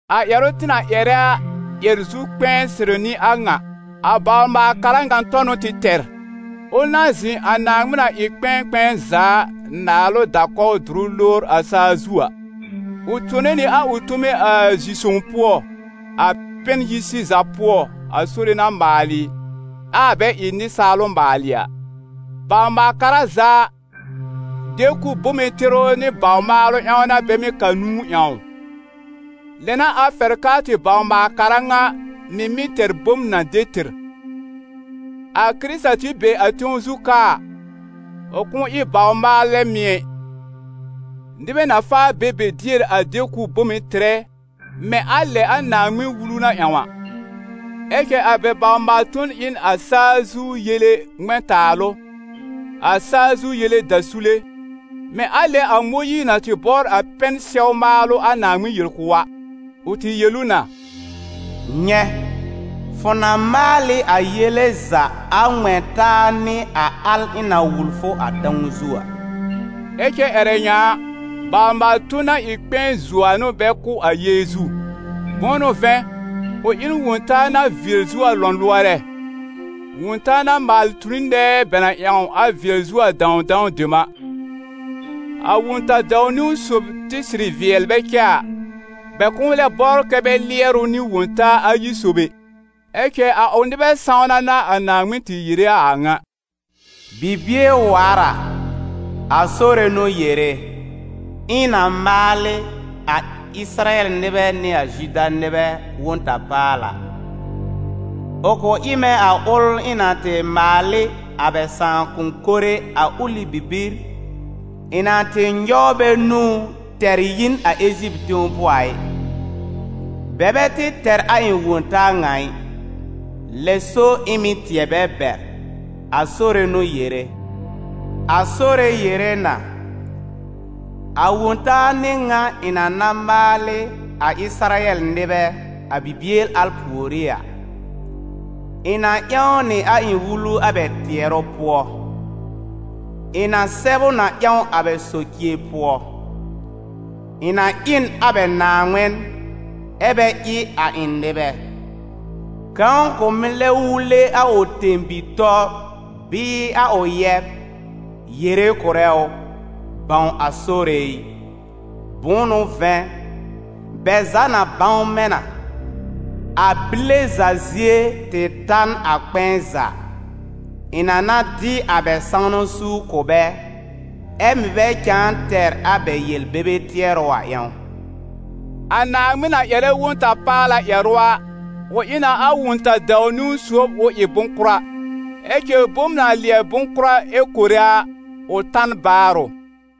A ƴɛrʋ tɩ na ƴɛrɛ a ƴɛr-zu-kpɛ̃ɛ sɩrɩ n'ɩ a ŋa: a bawr-maal-kara ŋa tɔ n'ʋ tɩ tɛr, ʋl na zɩ̃ a Naaŋmɩn na ɩ kpɛ̃ɛ kpɛ̃ɛ za a naalʋ da-kɔw dʋrʋ lowr a saa zu a. Ʋ tone nɩ a ʋ tome a zi-sõw pʋɔ, a pɛn-yi-sɩza pʋɔ a Sore na maalɩ, ɛ a bɛ ɩ nɩsaal ʋ maalɩ a. Bawr-maal-kara za a, de-kʋb bome tɩrʋ nɩ bawr maalʋ ƴãw n'a bɛ mɩ́ ka nũu ƴãw ʋ: lɛ n'a a fɛr k'aa tɩ bawr-maal-kara ŋa mɩ̀ mɩ́ tɛr bom na de tɩr. A Kɩrɩta tɩ be a tẽw zu ka a, ʋ kʋ̃ʋ ɩ bawr-maalɛ mɩ̀ ɛ, nɩbɛ na faa be be dier a de-kʋb bome tɩrɛ mɛ̃ a lɛ a Naaŋmɩn-Wulu na ƴãw a. Ɛ cɛ a bɛ baw-maal-ton ɩ n a saa zu yele ŋmɛ̃-taalʋ, a saa zu yele dasule, mɛ̃ a lɛ a Mõyiir na tɩ bɔbr a pɛn-sɛw maalʋ a Naaŋmɩn yel kʋ̀ ʋ a; ʋ tɩ yel ʋ na: «Nyɛ̃, fʋ na maal ɩ a yele za a ŋmɛ̃ taa nɩ a al ɩ̃ na wul fʋ a tãw zu a.» Ɛ cɛ ƴɛrɛ ŋa a, baw-maal-ton na ɩ kpɛ̃ɛ zuo a n'ʋ bɛ kʋ̀ a Yeezu; bʋ̃ʋ n'ʋ vɛ̃, ʋ ɩ n wõ-taa na vɩɛl zuo a lɔ̃lʋɔrɛ, wõ-taa na maalɩ tu n nɛɛ bɛ na ƴãw a vɩɛl zuo a dãwdãw dem a. A Wõ-ta-dãw-niwn sob tɩ sɩrɩ vɩɛl bɛ cɛ a, bɛ kʋ̃ʋ lɛ bɔbr kɛ bɛ lɩɛr ʋ nɩ wõ-taa ayi sob ɛ. Ɛ cɛ a ʋ nɩbɛ sãwna n'a a Naaŋmɩn tɩ yere a a ŋa: «Bibie waar a, a Sore n'ʋ yere, ɩ̃ na maal ɩ a Ɩsɩrayɛl nɩbɛ nɩ a Zuda nɩbɛ Wõ-ta-paala. Ʋ kʋ̃ ɩ mɛ̃ a ʋl ɩ̃ na tɩ maal ɩ a bɛ sãakʋm mɩnɛ a ʋlɩ bibir ɩ̃ na tɩ nyɔw bɛ nũú, tɛr yi n a Eziptɩ tẽw pʋɔ a ɩ. Bɛ bɛ tɩ tɛr a ɩ̃ wõ-taa ŋa ɩ, lɛ so ɩ̃ mɩ̀ tɩɛ bɛ bɛr, a Sore n'ʋ yere. A Sore yere na, a Wõ-taa n'ɩ ŋa ɩ̃ na na maal ɩ a Ɩsɩrayɛl nɩbɛ, a bibie al pùorí a: Ɩ̃ na ƴãw nɩ a ɩ̃ Wulu a bɛ tɩɛrʋ pʋɔ, ɩ̃ na sɛb ʋ na ƴãw a bɛ socie pʋɔ. Ɩ̃ na ɩ n a bɛ Naaŋmɩn, ɛ bɛ ɩ a ɩ̃ nɩbɛ. Kãw kʋ̃ mɩ́ lɛ wule a ʋ tẽ-bi-tɔ bɩɩ a ʋ yɛb, yere kʋ̀rɛ ʋ: ‹Bãw a Sore ɩ›. Bʋ̃ʋ n'ʋ vɛ̃, bɛ za na bãw mɛ̃ na, a bile za zie tɩ ta n a kpɛ̃ɛ za, ɩ̃ na na dɩ a bɛ sãwna suur kʋ̀ bɛ, ɛ mɩ̀ bɛ cãa tɛr a bɛ yel-bebe tɩɛrʋ a ƴãw.» A Naaŋmɩn na ƴɛrɛ Wõ-ta-paala ƴɛrʋ a, ʋ ɩ na a wõ-ta-dãw-niwn sob ʋ ɩ bʋ̃-kʋra, ɛ cɛ bom na lɩɛbɩ bʋ̃-kʋra ɛ kore a, ʋ ta n baarʋ.